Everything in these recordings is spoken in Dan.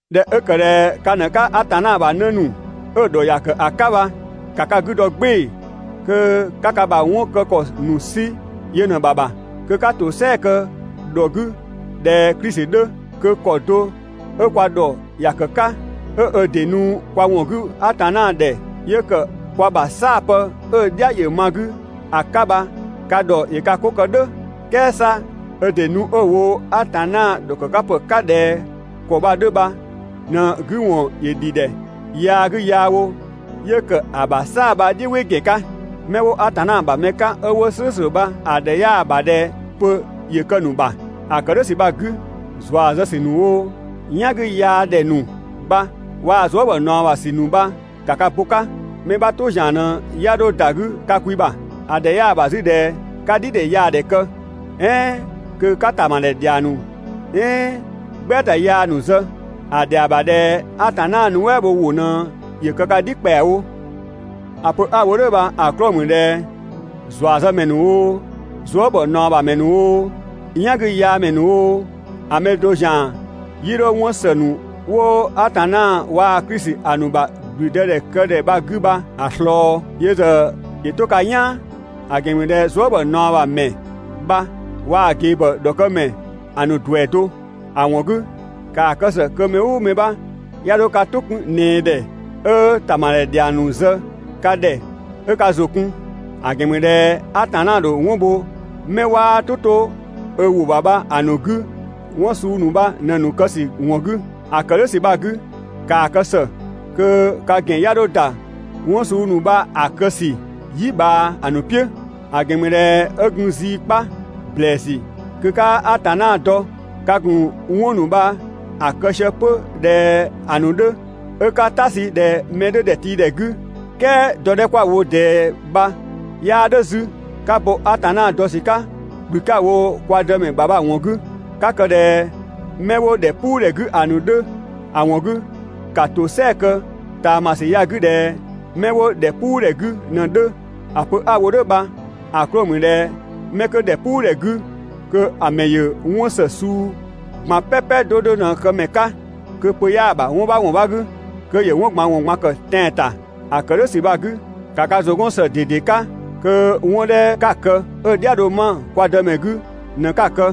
꞊Dhɛ 'ö ‑kë ꞊dhɛ ka ꞊në 'ka Atanna ‑bha 'në ‑nu 'ö‑ ‑dhɔ ‑ya ‑kë ‑a 'ka bha, ‑ka ka 'gü dɔ "gbɩɩ‑ kö 'ka ka ‑bha 'wɔn kë ‑kɔ ‑nu 'sü yö ꞊në‑ ‑bha ‑bha. Kö 'ka ‑tosɛa kë ‑dhɔ 'gü ꞊dhɛ Klisi 'dhö, kö ‑kɔ do 'ö kwa ‑dhɔ ‑ya ‑kë 'ka, 'ö ö ‑dɩ nu kwa ‑wɔn 'gü Atanna ‑dhɛ 'yö ‑kë kwa ‑bha "saapë 'ö‑ "dhia ‑yö ma‑ 'gü ‑a 'ka bha ka ‑dhɔ ‑yö ka 'ko kë "dhʋ̈. "Kɛɛ 'sa ö ‑dɩ nu 'ö‑ wo Atanna ‑dhɔkëkapë 'ka ꞊dhɛ ‑kɔ bha‑ 'dhö bha ꞊në‑ 'gü ‑wɔn ‑yö ‑dhi ‑dhɛ yaa 'gü yaa wo 'yö ‑kë ‑a ‑bha "saa‑ bha‑ "dhiʋ̈ "wɩ ‑gɛn 'ka. 'Mɛ 'wo Atanna ‑bha mɛ 'ka 'ö 'wo "slʋ̈ʋ̈slʋ̈ bha‑ ‑dhɛ 'yaa‑ ‑bha ꞊dhɛ pö ‑yö kë‑ ‑nu ‑bha. ‑A ‑kë "dhʋ̈ ‑sü bha‑ 'gü, ‑zua zë ‑sü ‑nu oo, "yan 'gü yaa ‑dhɛ ‑nu bha waa‑ zuë" ‑bhɔ ꞊naɔ ‑bha ‑sü ‑nu bha, ‑ka ka bo‑ 'ka. Mɛ 'bha "tʋ ‑zian ꞊në 'ya 'dho ‑da 'gü ka kwi ‑bha. ‑A ‑dhɛ 'yaa‑ ‑bha 'zü ꞊dhɛ 'ka "dhidhɛyaadhɛ kë, "ɛɛn kö 'ka ‑tamadhɛ ‑dhiang ‑nu "ɛɛn "gbɛata yaa ‑nu zë. ‑A ‑dhɛa ‑bha ꞊dhɛ Atanna nuɛ" bho ‑wʋ ꞊në ‑yö kë ka "dhi ‑kpɛawo. ‑A pö 'a‑ wo ka ‑dhɛ "dhʋ̈ bha‑ 'klɔɔ‑ ‑mü ꞊dhɛ ‑zuazëmɛ ‑nu oo, zuë" ‑bhɔ ꞊naɔ ‑bha ‑mɛ ‑nu oo, "yangüyaamɛ ‑nu oo, ‑a mɛ do ‑zian 'yii 'dho 'wɔn ‑së ‑nu 'wo Atanna waa‑ Klisi ‑a ‑nu ‑bha ‑gblüdëdhɛkëdhɛ bha‑ 'gü bha‑ ꞊slɔɔ. Yö ‑zë ‑yö 'to ka "yaan. (‑A ‑gɛn ‑mü ꞊dhɛ zuë" ‑bhɔ ꞊naɔ ‑bha ‑mɛ bha waa‑ ꞊gebhɔ ‑dhɔkëmɛ ‑a ‑nu ‑duɛ do.) ‑A ‑wɔn 'gü, ‑kaa kë ‑së kö mɛ "ʋʋ mɛ 'bha 'ya 'dho ka "tʋ 'kun ꞊nɛɛ ‑dhɛ 'ö ‑tamadhɛ ‑dhiang ‑nu zë ka ‑dhɛ 'ö ka ‑zʋ kun. ‑A ‑gɛn ‑mü ꞊dhɛ Atanna ‑dho 'wɔn bho 'mɛ 'waa "tʋ 'to ö ‑wʋ ‑bha bha‑ ‑nu 'gü 'wɔn suu ‑nu bha ꞊në‑ kë ‑sü ‑wɔn 'gü. ‑A ‑kë "dhʋ̈ ‑sü bha‑ 'gü, ‑kaa kë ‑së kö ka ‑gɛn 'ya 'dho ‑da 'wɔn suu ‑nu bha‑ kë ‑sü "yi ꞊bhaa ‑a ‑nu "piʋ̈. ‑A ‑gɛn ‑mü ꞊dhɛ 'ö gun zii 'kpa ‑blɛɛsü kö 'kaa Atanna dɔ ka ‑gun 'wɔn ‑nu bha‑ kë sië 'pö ꞊dhɛ ‑a ‑nu 'dhö 'ö 'ka "ta sü ꞊dhɛ mɛ 'dhö ‑dhɛtiidhɛ 'gü, "kɛɛ dɔ 'dhɛ 'kwa‑ wo ꞊dɛɛ bha 'yaa "dhʋ̈ 'zü, 'ka bo Atanna dɔ ‑sü 'ka ‑kplü 'ka‑ wo kwa Dëmɛ ‑bha bha‑ ‑wɔn 'gü, 'ka kë ꞊dhɛ 'mɛ 'wo ‑dhɛpuudhɛ 'gü ‑a ‑nu 'dhö; ‑a ‑wɔn 'gü, ‑ka ‑tosɛa kë ꞊taamasü ya‑ 'gü ꞊dhɛ 'mɛ 'wo ‑dhɛpuudhɛ 'gü ꞊në‑ 'dhö. ‑A pö 'a‑ wo "dhʋ̈ bha‑ 'klɔɔ‑ ‑mü ꞊dhɛ 'mɛ 'kö ‑dhɛpuudhɛ 'gü kö‑ ‑mɛ ‑yö 'wɔn ‑së suu ꞊gban "pɛpɛ 'do 'do ꞊në‑ këmɛ 'ka, kö pö 'yaa‑ ‑bha 'wɔn 'bha ‑wɔn 'bha 'gü, kö ‑yö 'wɔn ꞊gban ‑wɔn ꞊gban kë tɛan‑ ‑ta. ‑A ‑kë "dhʋ̈ ‑sü bha‑ 'gü, ‑ka ka ‑zʋ 'gɔn ‑së ꞊dede 'ka kö 'wɔn 'dhɛ 'ka‑ kë 'ö‑ "dhia‑ dho 'ma kwa Dëmɛ bha‑ 'gü ꞊në 'ka‑ kë.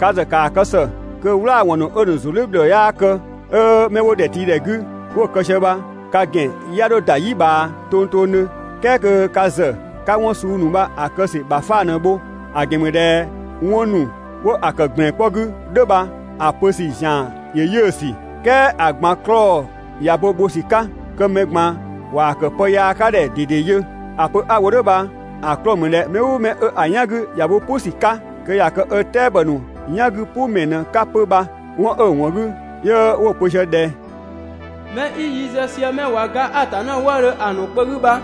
Ka ‑zë ‑kaa kë ‑së kö "wlaawɔn ‑nu 'ö‑ ‑nu ‑zun "dhiʋ̈ ‑bhlɔɔ 'yaa kë, 'ö 'mɛ 'wo ‑dhɛtiidhɛ 'gü, 'wo‑ kë sië bha ka ‑gɛn 'ya 'dho ‑da "yi ꞊bhaa tongtongdhö, "kɛɛ kö ka ‑zë 'ka 'wɔn suu ‑nu bha‑ kë ‑sü ‑bha 'fang ꞊në‑ bho. ‑A ‑gɛn ‑mü ꞊dhɛ 'wɔn ‑nu 'wo‑ ‑kë ‑gblɛn 'kpɔ 'gü "dhʋ̈ bha‑ pö ‑sü ‑zian ‑yö 'yiʋ̈‑ ‑sü. "Kɛɛ ‑a ꞊gban 'klɔɔ‑ ꞊ya bo bho ‑sü 'ka kö mɛ ꞊gban ꞊waa‑ ‑kë pë yaa 'ka ‑dhɛ ꞊dede yö. ‑A pö 'a‑ wo "dhʋ̈ bha‑ 'klɔɔ‑ ‑mü ꞊dhɛ mɛ "ʋʋ mɛ 'ö‑ "yan 'gü ꞊ya bo "pʋ ‑sü 'ka, kö ꞊ya kë ö "tɛabɔ ‑nu "yan 'gü "pʋ ‑mɛ ꞊në‑ 'ka 'pö bha. 'Wɔn 'ö‑ ‑wɔn 'gü, 'yö 'wo‑ pö ꞊sië ꞊dhɛ: «'Mɛ 'i yi zë sië mɛ ꞊wa ga Atanna wëëdhö ‑a ‑nu kpö 'gü bha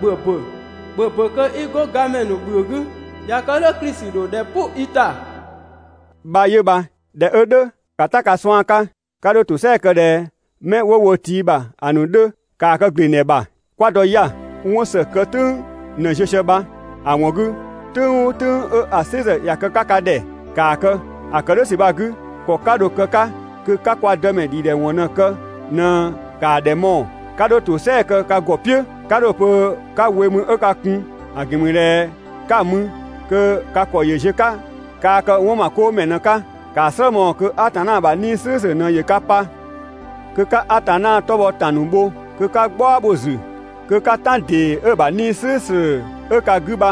‑bhö ‑bö, ‑bhö ‑bö kö 'i 'go gamɛ ‑nu ‑bhiëë 'gü. ꞊Ya kë "dhʋ̈ Klisi ‑dho ‑dhɛ "pʋ i ‑ta» bha 'yö bha. ꞊Dhɛ 'ö "dhʋ̈, ‑ka "ta ka suan' 'ka. 'Ka 'dho ‑tosɛa kë ꞊dhɛ 'mɛ 'wo wo tii ‑bha ‑a ‑nu 'dhö, ‑kaa kë ‑glengdhɛ ‑bha. 'Kwa dɔ 'ya‑, 'wɔn ‑së kë "tʋ̈ng ꞊në ziö sië bha, ‑a ‑wɔn 'gü "tʋ̈ng "ʋʋ "tʋ̈ng 'ö‑ "sɩ ‑zë ꞊ya kë‑ 'ka ka ‑dhɛ, ‑kaa kë. ‑A ‑kë "dhʋ̈ ‑sü bha‑ 'gü, ‑kɔ 'ka dho‑ kë‑ 'ka kö 'ka kwa Dëmɛ ‑dhidhɛwɔn ꞊në‑ kë ꞊në ‑kaa ‑dhɛ mɔɔ‑, 'ka 'dho ‑tosɛa kë ka ‑gɔ "piʋ̈. 'Ka dho‑ pö 'ka we mü 'ö ka kun, ‑a ‑gɛn ‑mü ꞊dhɛ 'ka‑ mü kö ka ‑kɔ ‑yö ziö‑ 'ka, kaa kë 'wɔnmakoomɛ ꞊në‑ 'ka. ‑Kaa "slë mɔɔ‑ kö Atanna ‑bha 'Nii‑ "slʋ̈ʋ̈slʋ̈ ꞊në ‑yö ka pa. Kö 'ka Atanna 'tɔ bhɔ ‑tan ‑nu bho, kö 'ka "gbaɔ bho‑ ‑zü, kö 'ka "tan ‑dee 'ö‑ ‑bha 'Nii‑ "slʋ̈ʋ̈slʋ̈ 'ö ka 'gü bha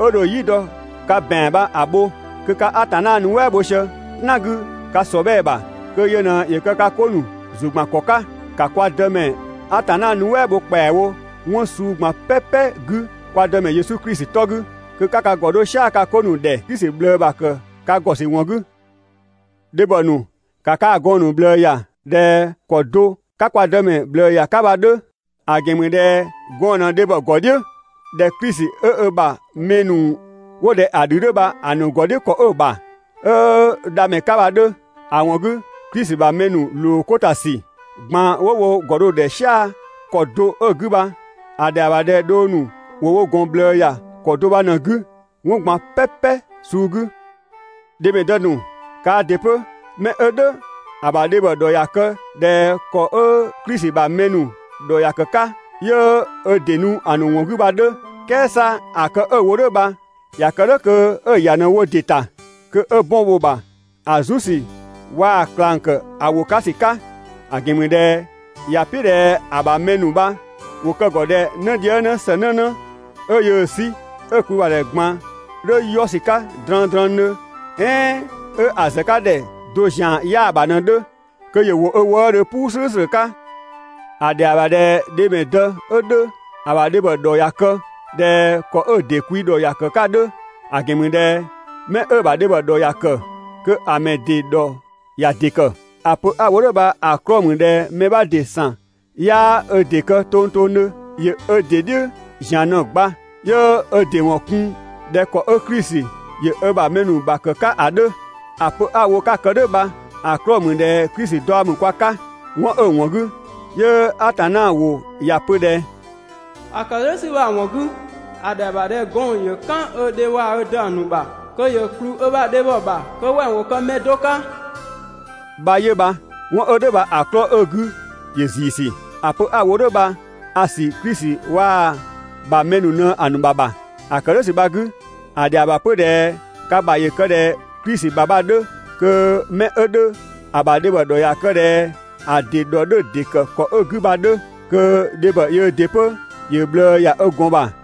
'ö dho "yi dɔ‑ 'ka ka ‑bɛan bha‑ bho. Kö ka Atanna nuɛ" bho sië "tan 'gü ka ‑sɔbhɛɛ ‑bha, kö yö ꞊në ‑yö kë ka 'ko ‑nu ‑zʋ ‑gban ‑kɔ 'ka. ‑Ka kwa Dë Atanna nuɛ" bho ‑kpɛawo 'wɔn suu ꞊gban "pɛpɛ 'gü kwa Dëmɛ Yesu Klisi 'tɔ 'gü. Kö 'ka ka ‑gɔ 'dho "sia‑ ka 'ko ‑nu ‑dhɛ Klisi ꞊bhlëë ‑bha ‑kë ka ‑gɔ ‑sü ‑wɔn 'gü. Dhebhɔ ‑nu, ‑ka kaa‑ gɔɔn‑ ‑nu ꞊bhlëë ‑ya ꞊dhɛ ‑kɔ do 'ka kwa Dëmɛ ꞊bhlëë ‑ya 'ka bha‑ 'dhö. ‑A ‑gɛn ‑mü ꞊dhɛ gɔɔn‑ ꞊në dhebhɔ ‑gɔ "dhiʋ̈ ꞊dhɛ Klisi 'ö ö ‑bha mɛ ‑nu 'wo ꞊dhɛ‑ ‑dhü 'dhö bha‑ ‑nu ‑gɔ "dhiʋ̈ ‑kɔ 'ö‑ ‑bha, 'ö‑ Dhamɛ 'ka bha‑ 'dhö. ‑A ‑wɔn 'gü, Klisi ‑bha mɛ ‑nu ‑loo 'ko ‑ta ‑sü ꞊gban 'wo wo ‑gɔ dho‑ ‑dhɛ "sia‑ ‑kɔ do 'ö‑ 'gü bha, ‑a ‑dhɛa ‑bha ꞊dhɛ dhong ‑nu ‑wo wo ‑gɔn ꞊bhlëë ‑ya ‑kɔ do bha ꞊në‑ 'gü 'wɔn ꞊gban "pɛpɛ suu 'gü. Dhemɛdë ‑nu kaa ‑dɩ 'pö, mɛ 'ö "dhʋ̈ ‑a ‑bha dhebhɔ ‑dhɔ ‑ya kë ꞊dhɛ ‑kɔ 'ö Klisi ‑bha mɛ ‑nu ‑dhɔ ‑ya ‑kë 'ka, 'yö ö ‑dɩ nu‑ ‑nu ‑wɔn 'gü bha‑ 'dhö. "Kɛɛ 'sa ‑a kë 'ö‑ wo "dhʋ̈ bha ‑ya kë "dhʋ̈ kö 'ö‑ ‑ya ꞊në‑ wo ‑dɩ ‑ta, kö 'ö 'bɔn bho‑ ‑bha ‑a "zu ‑sü waa‑ ꞊klang ‑kë ‑a ‑wʋ 'ka ‑sü 'ka. ‑A ‑gɛn ‑mü ꞊dhɛ ‑ya "piʋ̈ ꞊dhɛ ‑a ‑bha mɛ ‑nu bha ‑wo kë‑ ‑gɔ ꞊dhɛ 'nëdhiëngnë ‑së 'nënë 'ö yöö‑ 'sü, 'ö‑ kwi ‑bha ‑dhɛ ꞊gban 'dhö 'yɔ ‑sü 'ka drëngdrëngdhö, "ɛɛn 'ö‑ ‑zëkadhɛ do zian 'yaa‑ ‑bha ꞊në‑ 'dhö, kö ‑yö ‑wo ö wëëdhö "puu "slʋ̈ʋ̈slʋ̈ 'ka. ‑A ‑dhɛa ‑bha ꞊dhɛ dhemɛdë 'ö 'dhö ‑a ‑bha dhebhɔ ‑dhɔ ‑ya kë ꞊dhɛ ‑kɔ 'ö‑ ‑dɩ kwi ‑dhɔ ‑ya ‑kë 'ka ‑a 'dhö. ‑A ‑gɛn ‑mü ꞊dhɛ 'mɛ 'ö‑ ‑bha dhebhɔ ‑dhɔ ‑ya ‑kë, kö‑ mɛ ‑dɩ ‑dhɔ ‑ya ‑dɩ ‑kë. ‑A pö 'a‑ wo "dhʋ̈ bha‑ 'klɔɔ‑ ‑mü ꞊dhɛ mɛ 'bha ‑dɩ ‑san 'yaa ö ‑dɩ kë tongtongdhö. ‑Yö ö ‑dɩ "dhiʋ̈ ‑zian ꞊në‑ gba 'yö ö ‑dɩ ‑wɔn kun ꞊dhɛ ‑kɔ 'ö Klisi ‑yö ö ‑bha mɛ ‑nu ‑bha ‑kë 'ka ‑a 'dhö. ‑A pö 'a‑ wo 'ka‑ kë "dhʋ̈ bha‑ 'klɔɔ‑ ‑mü ꞊dhɛ Klisi daɔ ‑mü kwa 'ka. 'Wɔn 'ö‑ ‑wɔn 'gü 'yö Atanna ‑wʋ ‑ya pö ꞊dhɛ: «‑A ‑kë "dhʋ̈ ‑sü bha‑ ‑wɔn 'gü, ‑a ‑dhɛa ‑bha ꞊dhɛ gɔɔn‑ ‑yö "kan ö dhe waa‑ ö dë‑ ‑nu ‑bha kö ‑yö ‑kplü ö ‑bha dhebhɔ ‑bha kö wɛng ‑wo kë pë do 'ka bha 'yö bha.» 'Wɔn 'ö "dhʋ̈ bha‑ 'klɔɔ‑ 'ö‑ 'gü bha ‑yö ‑ziisü. ‑A pö 'a‑ wo "dhʋ̈ bha a‑ ‑sü Klisi waa‑ ‑bha mɛ ‑nu ꞊në‑ ‑nu ‑bha ‑bha. ‑A ‑kë "dhʋ̈ ‑sü bha‑ 'gü, ‑a ‑dhɛa ‑bha 'pö ꞊dhɛ ka ‑bha ‑yö kë ꞊dhɛ Klisi ‑bha bha‑ 'dhö kö 'mɛ 'ö 'dhö ‑a ‑bha dhebhɔ ‑dhɔ ‑ya kë ꞊dhɛ ‑a ‑dɩ ‑dhɔ 'dhö‑ ‑dɩ ‑kë ‑kɔ 'ö‑ 'gü bha‑ 'dhö. Kö dhebhɔ yöö ‑dɩ 'pö ‑yö ꞊bhlëë ‑ya ö ‑gɔn ‑bha.